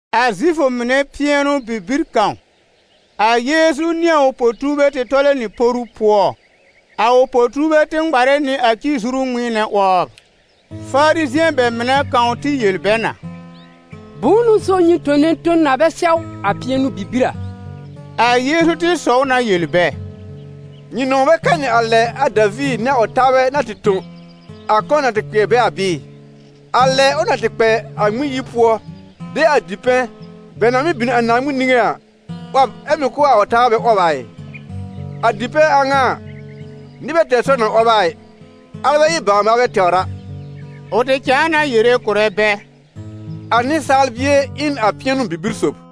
A Zifʋ mɩnɛ pɩɛnʋ-bibir kãw, aYeezu nɩ a ʋ po-tuurbɛ tɩ tɔlɛ nɩ poru pʋɔ. A ʋ po-tuurbɛ tɩ ŋmarɛ nɩ a ci-zuru ŋmɩɩnɛ 'wɔbr. Farizɩ̃ɛ bɛ mɩnɛ kãw tɩ yel bɛ na: «Bʋ̃ʋ n'ʋ so nyɩ tone ton na bɛ sɛw a pɩɛnʋ-bibir a?» A Yeezu tɩ sɔw na yel bɛ: «Nyɩ nɔ̃w bɛ kanɩ a lɛ a Daviir nɩ a ʋ taabɛ na tɩ tõ, a kɔ̃ na tɩ kpɩɛr bɛ a bɩɩ? A lɛ ʋ na tɩ kpɛ a Naaŋmɩn yir pʋɔ de a dipɛ̃, bɛ na mɩ́ bin a Naaŋmɩn niŋé a, 'wɔb ɛ mɩ̀ kʋ̀ a ʋ taabɛ bɛ 'wɔb a ɩ? A dipɛ̃ a ŋa a, nɩr bɛ tɛr sɔr na 'wɔb a ɩ, alɛ bɛ ɩ bawr-maalbɛ tɛwr a.» Ʋ tɩ cãa na yere kʋ̀rɛ bɛ: «A Nɩsaal Bie ɩ n a pɩɛnʋ-bibir sòb.»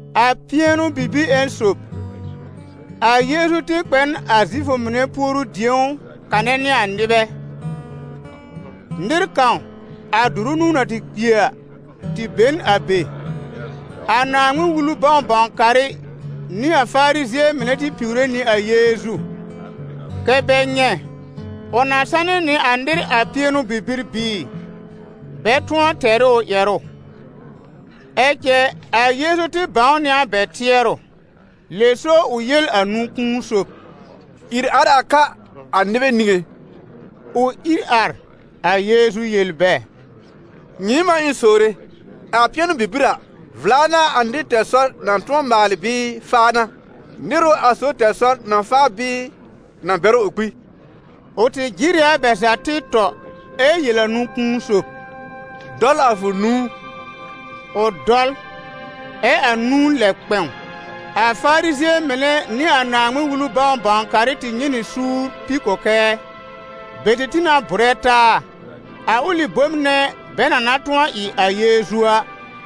A pɩɛnʋ-bibir ƴẽn sob, a Yeezu tɩ kpɛ n a Zifʋ mɩnɛ puoru-dĩ̀ó kanɛ nɩ a nɩbɛ. Nɩr kãw, a dʋrʋ nũu na tɩ kpi a, tɩ be n a be. A Naaŋmɩn-Wulu bãw-bãw-karɩ nɩ a Farizɩ̃ɛ mɩnɛ tɩ piwre nɩ a Yeezu, kɛ́ bɛ nyɛ̃ ʋ na sanɩ nɩ nɩr a pɩɛnʋ-bibir bɩɩ, bɛ tʋ̃ɔ tɛr ɩ ʋ ƴɛrʋ. Ɛ cɛ a Yeezu tɩ bãw nɩ a bɛ tɩɛrʋ. Lɛ so ʋ yel a nũ-kũu sob: «Ìr ar a ka a nɩbɛ niŋé.» Ʋ ìr ar. A Yeezu yel bɛ: «Nyɩɩm n'a ɩ̃ sowre: a pɩɛnʋ-bibir a, vla n'a a nɩr tɛr sɔr na tʋ̃ɔ maalɩ bɩɩ faa n'a? Nɩr ʋ a sob tɛr sɔr na faa bɩɩ na bɛr ʋ kpi?» Ʋ tɩ jɩr ɩ a bɛ za tɩ tɔ, ɛ yel a nũ-kũu sob: «Dɔl a fʋ nũu.» Ʋ dɔl, ɛ a nũu lɛb kpɛ̃w. A Farizɩ̃ɛ mɩnɛ nɩ a Naaŋmɩn-Wulu bãw-bãw-karɩ tɩ nyɛ̃ nɩ suur pi kɔkɛɛ. Bɛ tɩ tĩ na bʋrɛ taa a ʋlɩ bom nɛ bɛ na na tʋ̃ɔ ɩ a Yeezu a.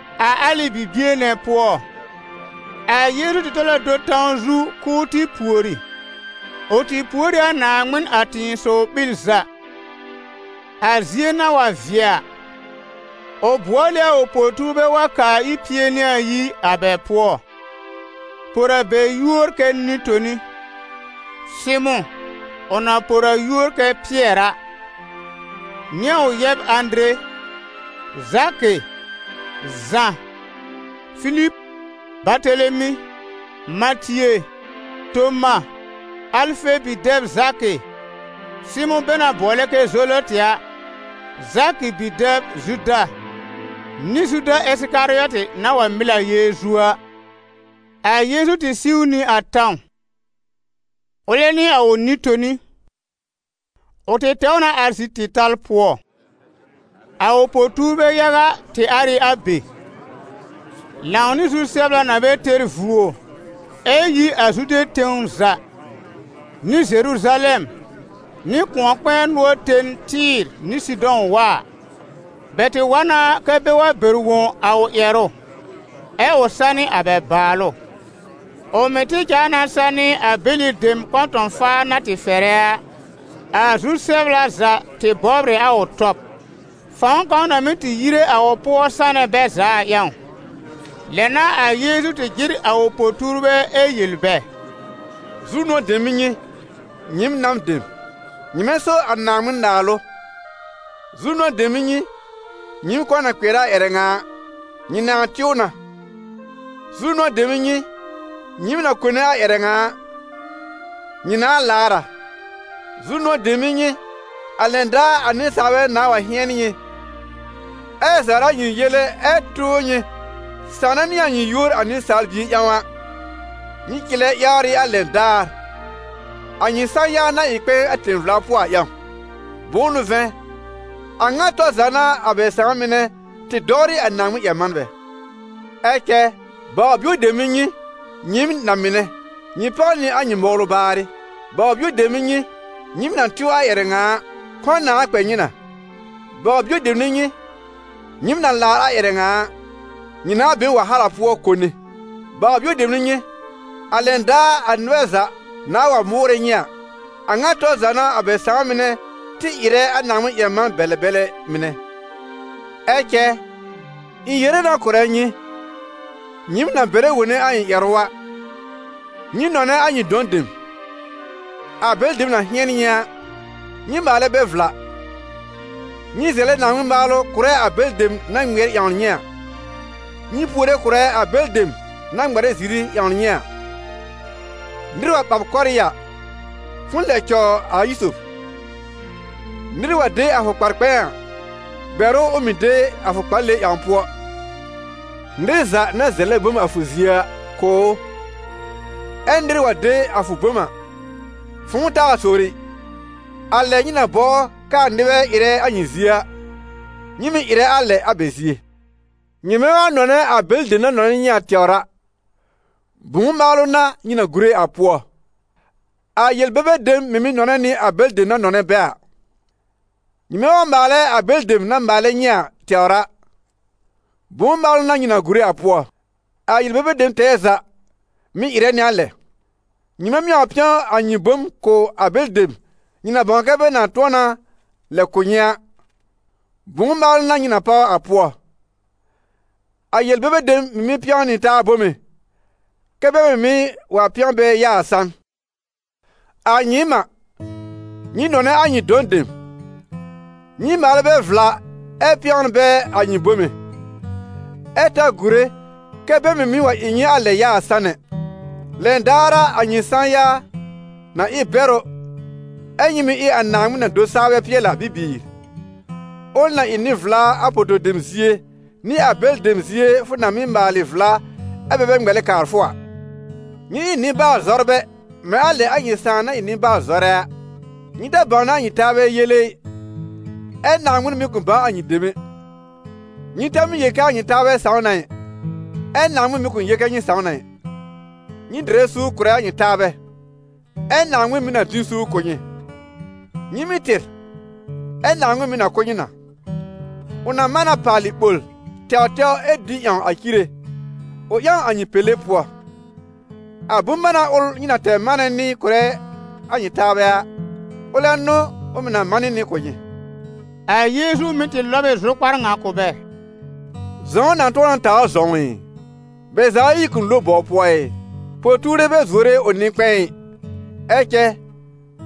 A alɩ bibie nɛ pʋɔ, a Yeezu tɩ tɔl a do tãw zu k'ʋʋ tɩ pùori. Ʋ tɩ pùor ɩ a Naaŋmɩn a tɩ̃ɩsɔw-ɓil za. A zie na wa vɩɛ a, ʋ bʋɔl ɩ a ʋ po-tuurbɛ wa kaa ir pie nɩ ayi a bɛ pʋɔ, por a bɛ yúor kɛ nɩ-toni: Sɩmʋ̃, ʋ na por a yúor kɛ Pɩɛr a, nɩ a ʋ yɛb Ãdere, Zakɩ, Zã, Filib, Batelemi, Matie, Toma, Alfe bi-dɛb Zakɩ, Sɩmʋ̃ bɛ na bʋɔlɛ kɛ Zelɔtɩ a, Zakɩ bi-dɛb Zuda nɩ Zuda Ɩsɩkarɩɔtɩ na wa mɩl a Yeezu a. A Yeezu tɩ siw nɩ a tãw, ʋlɛ nɩ a ʋ nɩ-toni. Ʋ tɩ tɛw na ar zi-tɩ̃tal pʋɔ. A ʋ po-tuurbɛ yaga tɩ ar ɩ a be, lãw nɩ zu-sɛbla na bɛ tɛr vuo ɩ yi a Zude tẽw za, nɩ Zeruzalɛm, nɩ kʋ̃ɔ-kpɛ̃ɛ nʋɔr ten Tɩ́ɩ̀r nɩ Sɩdɔ̃ wa a. Bɛ tɩ wa na kɛ bɛ wa bɛr wõ a ʋ ƴɛrʋ, ɛ ʋ sanɩ a bɛ bàalʋ; ʋ mɩ̀ tɩ cãa na sanɩ a bɛlɩ dem kɔ̃tɔ̃-faar na tɩ fɛrɛ a. A zu-sɛbla za tɩ bɔbr ɩ a ʋ tɔb, fãw kãw na mɩ́ tɩ yire a ʋ pʋɔ sanɛ bɛ za a ƴãw. Lɛ n'a a Yeezu tɩ jɩr a ʋ po-tuurbɛ ɛ yel bɛ: «Zu-nʋ̃ɔ̀ dem n'ɩ nyɩ, nyɩɩm nan dem: nyɩmɛ so a Naaŋmɩn-Naalʋ! Zu-nʋ̃ɔ̀ dem n'ɩ nyɩ, nyɩɩm kɔ̃ na kpɩɛr a ƴɛrɛ ŋa a: nyɩ nãa tɩw na! Zu-nʋ̃ɔ̀ dem n'ɩ nyɩ, nyɩɩm na kone a ƴɛrɛ ŋa a: nyɩ nãa laar a!» «Zu-nʋ̃ɔ̀ dem n'ɩ nyɩ, a lɛn daar a nɩsaalbɛ nãa wa hɩ̃ɛn nyɩ, ɛ zawrɛ a nyɩ yele ɛ tʋʋr nyɩ, sãwnɛ nɩ a nyɩ yúor a Nɩsaal Bie ƴãw a. Nyɩ cɩlɛ yawr ɩ a lɛn daar, a nyɩ sã-ya na ɩ kpɛ̃ɛ a tẽ-vla pʋɔ a ƴãw; bʋ̃ʋ n'ʋ vɛ̃, a ŋa tɔr za n'a a bɛ sãà mɩnɛ tɩ dɔwrɩ a Naaŋmɩn-ƴɛr-manbɛ. «Ɛ cɛ baw-bio dem n'ɩ nyɩ, nyɩɩm na-mɩnɛ, nyɩ páw nɩ a nyɩ mɔwlʋ baarɩ! Baw-bio dem n'ɩ nyɩ, nyɩɩm na tɩw a ƴɛrɛ ŋa a, kɔ̃ nãa kpɛ nyɩ na! Baw-bio dem n'ɩ nyɩ, nyɩɩm na laar a ƴɛrɛ ŋa a, nyɩ nãa be n wahala pʋɔ kone! Baw-bio dem n'ɩ nyɩ, a lɛn daar a nɩbɛ za nãa wa mʋʋrɛ nyɩ a, a ŋa tɔr za n'a a bɛ sãa mɩnɛ tɩ ɩrɛ a Naaŋmɩn-ƴɛr-man-bɛlɛ-bɛlɛ mɩnɛ!» « Ɛ cɛ ɩ̃ yere na kʋ̀rɛ nyɩ, nyɩɩm na bɛrɛ wone a ɩ̃ ƴɛrʋ a: nyɩ nɔnɛ a nyɩ dɔ̃ dem; a bɛlɩ dem na hɩɛn nyɩ a, nyɩ maalɛ bɛ vla. Nyɩ zɛlɛ Naaŋmɩn maalʋ kʋ̀rɛ a bɛlɩ dem na ŋmɩɛr ƴãwn nyɩ a, nyɩ puore kʋ̀rɛ a bɛlɩ dem na ŋmarɛ ziri ƴãwn nyɩ a. Nɩr wa ɓa b kɔ́rɩ́ a, fʋ̃ʋ lɛb cɔw a ayi sob. Nɩr wa de a fʋ kpar-kpɛ̃ɛ a, bɛr ʋ ʋ mɩ̀ de a fʋ kpale ƴãw pʋɔ. Nɩr za na zɛlɛ bom a fʋ zie a, kʋ̀ ʋ, ɛ nɩr wa de a fʋ bom a, fʋ̃ʋ taa sowre ɩ. A lɛ nyɩ na bɔbr kɛ a nɩbɛ ɩrɛ a nyɩ zie a, nyɩ mɩ̀ ɩrɛ a lɛ a bɛ zie. Nyɩmɛ wa nɔnɛ a bɛlɩ dem na nɔnɛ nyɩ a tɛwr a, bʋ̃ʋ maalʋ n'a nyɩ na gùre a pʋɔ? A yel-bebe dem mɩ̀ mɩ́ nɔnɛ nɩ a bɛlɩ dem na nɔnɛ bɛ a. Nyɩmɛ wa maalɛ a bɛlɩ dem na maalɛ nyɩ a tɛwr a, bʋ̃ʋ maalʋ n'a nyɩ na gùre a pʋɔ? A yel-bebe dem tɛɛ za mɩ̀ ɩrɛ nɩ a lɛ. Nyɩmɛ mɩ́ wa pɛ̃w a nyɩ bom kʋ̀ a bɛlɩ dem nyɩ na bãw kɛ bɛ nãa tʋ̃ɔ na lɛb kʋ̀ nyɩ a, bʋ̃ʋ maalʋ n'a nyɩ na páw a pʋɔ? A yel-bebe dem mɩ̀ mɩ́ pɛ̃wn nɩ taa bome, kɛ́ bɛ mɩ̀ mɩ́ wa pẽw bɛ yaa a sãn. «A nyɩɩm n'a, nyɩ nɔnɛ a nyɩ dɔ̃ dem, nyɩ maalɛ bɛ vla ɛ pɛ̃wn bɛ a nyɩ bome, ɛ ta gùre kɛ bɛ mɩ̀ mɩ́ wa ɩ nyɩ a lɛ yaa a sãn ɛ. Lɛn daar a, a nyɩ sã-ya na ɩ bɛrʋ, ɛ nyɩ mɩ̀ ɩ a Naaŋmɩn-na-do-saa-bɛ-pɩɛl-a bibiir, ʋl na ɩ nɩ-vla a poto-dem zie, nɩ a bɛlɩ dem zie fʋ na mɩ́ maalɩ vla ɛ bɛ bɛ ŋmɛlɛ kaar fʋ a. Nyɩ ɩ nɩ-baal-zɔrbɛ mɛ̃ a lɛ a nyɩ Sãà na ɩ nɩ-baal-zɔrɛ a.» «Nyɩ ta bãwnɛ a nyɩ taabɛ yele ɩ, ɛ Naaŋmɩn mɩ̀ kʋ̃ bãw a nyɩ dem ɛ. Nyɩ ta mɩ́ yel kɛ a nyɩ taabɛ sãw na ɩ, ɛ Naaŋmɩn mɩ̀ kʋ̃ yel kɛ nyɩ sãw na ɩ. Nyɩ dɩrɛ suur kʋ̀rɛ a nyɩ taabɛ, ɛ Naaŋmɩn mɩ̀ na dɩ n suur kʋ̀ nyɩ. Nyɩ mɩ́ tɩr, ɛ Naaŋmɩn mɩ̀ na kʋ̀ nyɩ na. Ʋ na manɩ na paalɩ ɓol, tɛwtɛw ɛ dĩ ƴãw a cire, ʋ ƴãw a nyɩ pèlé pʋɔ. A bʋ̃-mána ʋl nyɩ na tɛr manɛ nɩ kʋ̀rɛ a nyɩ taabɛ a, ʋlɛ n'ʋ ʋ mɩ̀ na manɩ nɩ kʋ̀ nyɩ.» A Yeezu mɩ̀ tɩ lɔb ɩ zʋkpar kʋ̀ bɛ yel: «Zɔ̃w na tʋ̃ɔ na tawr zɔ̃w ɩ? Bɛ za ayi kʋ̃ lo bɔw pʋɔ ɩ? Po-tuure bɛ zuore ʋ nɩ-kpɛ̃ɛ ɩ, ɛ cɛ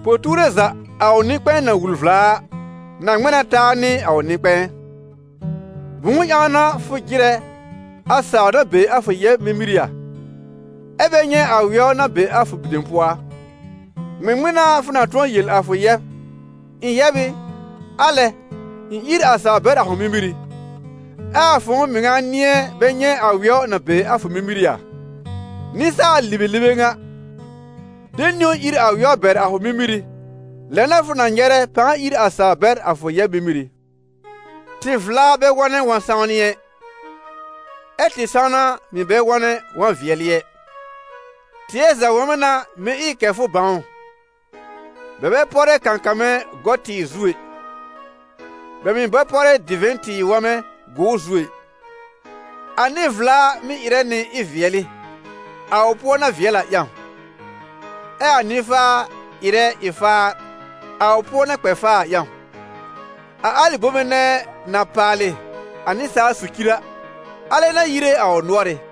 po-tuure za, a ʋ nɩ-kpɛ̃ɛ na wul vla a, na ŋmɛ̃ na taa nɩ a ʋ nɩ-kpɛ̃ɛ. Bʋ̃ʋ ƴãw n'a fʋ jɩrɛ a sawr na be a fʋ yɛb mímírí a, ɛ bɛ nyɛ̃ a wɛw na be a fʋ dem pʋɔ a? Ŋmɩŋmɩn n'a fʋ na tʋ̃ɔ yel a fʋ yɛb: ‹ Ɩ̃ yɛb ɩ, alɛ ɩ̃ ír sawr bɛr a fʋ mímírí!› Ɛ a fʋ̃ʋ mɩŋa nɩ̃ɛ bɛ nyɛ̃ a wɛw na be a fʋ mímírí a? Nɩsaal-libelibe ŋa! De niwn ír a wɛw bɛr a fʋ mímírí, lɛ n'a fʋ na nyɛrɛ pãa ír a sawr bɛr a fʋ yɛb mímírí.» «Tɩ-vla bɛ wɔ̃nɛ wɔ̃-sãwnɩ ɛ, ɛ tɩ-sãwna mɩ̀ bɛ wɔ̃nɛ wɔ̃-vɩɛlɩ ɛ. Tɩɛ za wɔ̃mɛ n'a mɩ́ ɩ kɛ fʋ bãw ʋ. Bɛ bɛ pɔrɛ kãkãmɛ gɔ-tɩɩr zu ɛ, bɛ mɩ̀ bɛ pɔrɛ divɛ̃ tɩɩr wɔmɛ gʋʋr zu ɛ. A nɩ-vla mɩ́ ɩrɛ nɩ ɩ-vɩɛlɩ, a ʋ pʋɔ na vɩɛl a ƴãw. Ɛ a nɩ-faa ɩrɛ ɩ-faar, a ʋ pʋɔ na kpɛ faa a ƴãw. A alɩ bome nɛ na paalɩ a nɩsaal socir a, alɛ n'a yire a ʋ nʋ́ɔrɩ́.»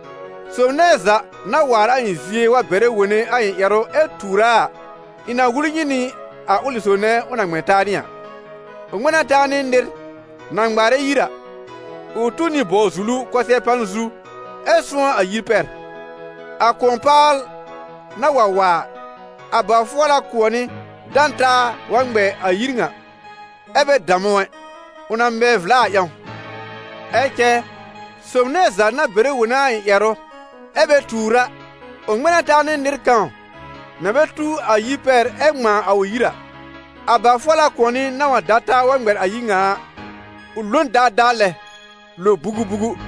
Sob nɛ za na waar a ɩ̃ zie wa bɛrɛ wone a ɩ̃ ƴɛrʋ ɛ tuur a, ɩ̃ na wul nyɩ nɩ a ʋlɩ sob nɛ ʋ na ŋmɛ̃ taa nɩ a. Ʋ ŋmɛ̃ na taa nɩ nɩr na ŋmaarɛ yir a: ʋ tuw nɩ bɔw-zulu kʋsɛ-pan zu ɛ sʋ̃ɔ́ a yir pɛr. A kʋ̃ɔ-paal na wa wa a, a ba-fʋɔla kʋ̃ɔnɩ da n taa wa ŋmɛ a yir ŋa, ɛ bɛ dam ʋ ɛ, ʋ na mɛ vla a ƴãw. Ɛ cɛ sob nɛ za na bɛrɛ wone a ɩ̃ ƴɛrʋ ɛ bɛ tuur a, ʋ ŋmɛ̃ na taa nɩ nɩr kãw na bɛ tuw a yir pɛr ɛ ŋmãa a ʋ yir a: a ba-fʋɔla kʋ̃ɔnɩ na wa da taa wa ŋmɛ a yir ŋa a, ʋ lo n daadaa lɛ, lo bugubugu.»